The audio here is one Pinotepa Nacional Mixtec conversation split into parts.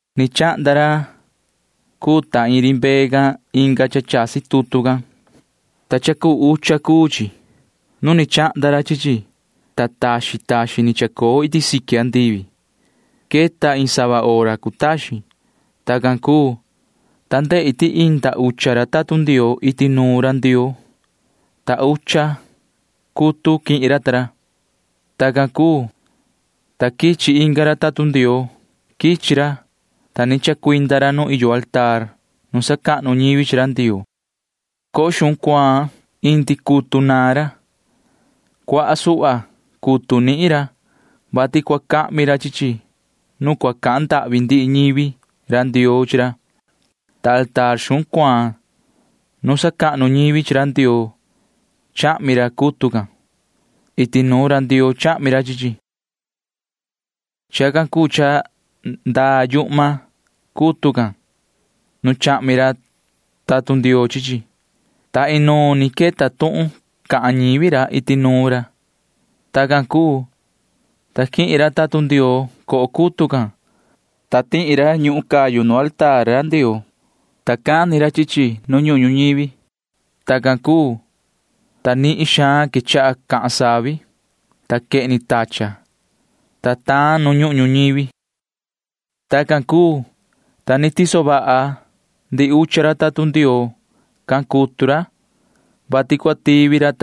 Ni chahnda ra cuu ta ri mbee can inga cha chasi tutu can, ta cha cuu ucha cuu chi. Nu ni chahnda ra chi chi, ta taxin taxin ni chacoo iti siqui andivi. Queta iin sava hora cutaxin. Tacan cuu, ta ndehi ti inda ucha tatun Ndioo iti nuun ra Ndioo, ta ucha cutu quihin ra ta ra. Tacan cuu, ta quichi inga ra tatun Ndioo. Quichi ra, ta ni chacuinda ra nu iyo mesa nu sacahnu ñivi chi ra Ndioo. Coho xuhun cuaan indi cutu naan ra. Cuaha suhva cutu nihin ra, vati cua cahmi ra chi chi nu cahan ndahvi ndihi ñivi ra Ndioo chi ra, ta mesa xuhun cuaan nu sacahnu ñivi chi ra Ndioo chahmi ra cutu can. Iti nuun ra Ndioo chahmi ra chi chi. Chacan cuu cha ndaa yuhma cutu can [nu chahmi ra tatun Ndioo chi chi], ta inuun ni queta tuhun cahan ñivi ra iti nuun ra. Tacan cuu, ta quihin ra tatun Ndioo coho cutu can, ta tihi ra ñuhun cayu nu mesa ra Ndioo, ta cani ra chi chi nu ñuhun ñuhun ñuñivi. Tacan cuu, ta nihin xaan quechaha cahan savi, ta quehni tachan, ta taan nu ñuhun ñuñivi. Tacan cuu, ta ni tiso vaha ndihi ucha ra tatun Ndioo can cutu ra, vati cua tivi ra.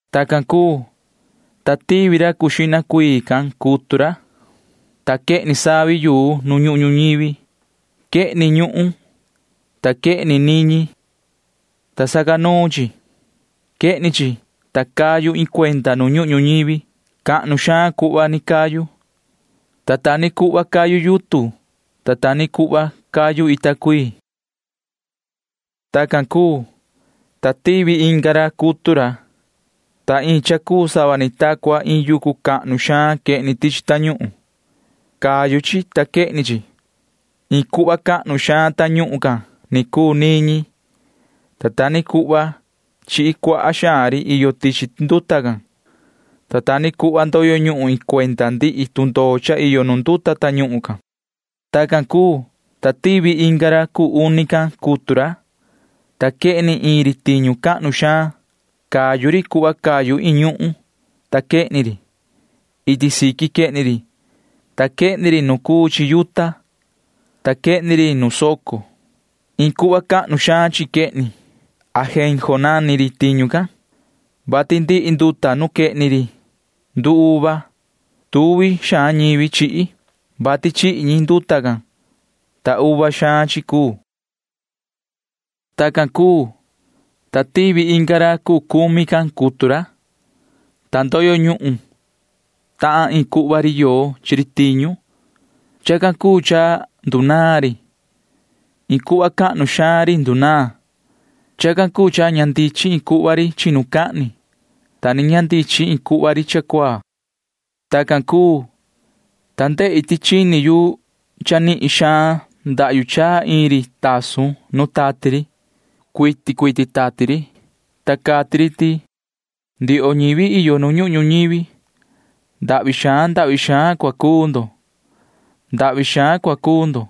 Tacan cuu, ta tivi ra cuu xihna cuii, ta quehni savi yuu nu ñuhun ñuñivi. Quehni ñuhun, ta quehni niñi, ta sacanuun chi. Quehni chi, ta cayu iin cuenda nu ñuhun ñuñivi. Cahnu xaan cuhva ni cayu, ta ta ni cuhva cayu yutun, ta ta ni cuhva cayu ita cuii. Tacan cuu, ta tivi inga ra, ta iin cha cuu sava ni ta cua iin yucu cahnu xaan quehni tichi tañuhun. Cayu chi, ta quehni chi. Iin cuhva cahnu xaan tañuhun can ni cuu niñi, ta ta ni cuhva chihi cuaha xaan ri iyo tichi nduta can, ta ta ni cuhva ndoyo ñuhun iin cuenda ndihi tundoo cha iyo nu nduta tañuhun can. Tacan cuu, ta tivi inga ra cuu uni, ta quehni iin ri tiñu cahnu xaan. Cayu ri cuhva cayu iin ñuhun, ta quehni ri. Iti siqui quehni ri, ta quehni ri nu cuu chi yuta, ta quehni ri nu soco. Iin cuhva cahnu xaan chi quehni ri. Ajenjo nani ri tiñu can, vati ndihi nduta nu quehni ri nduuva. Tuvi xaan ñivi chihi, vati chihi ñi nduta can, ta uva xaan chi cuu. Tacan cuu, ta tivi inga ra cuu cumi, ta ndoyo ñuhun tahan iin cuhva ri yoo chi ri tiñu. Chacan cuu cha ndunaan ri. Iin cuhva cahnu xaan ri ndunaan. Chacan cuu cha ña ndichin iin cuhva ri chinucahni, ta ni ña ndichin iin cuhva ri cha cuaa. Tacan cuu, ta ndehi ti chini yu cha nihin xaan ndahyu chaa iin ri tasun nu tati ri. Cuiti cuiti tati ri, ta cati ri ti: ―Ndioho ñivi iyo nu ñuhun ñuñivi, ndahvi xaan ndahvi xaan cua cuu ndo. Ndahvi xaan cua cuu ndo,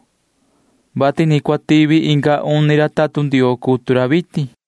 vati ni cua tivi inga uni ra tatun Ndioo cutu ra vitin ―cati ri.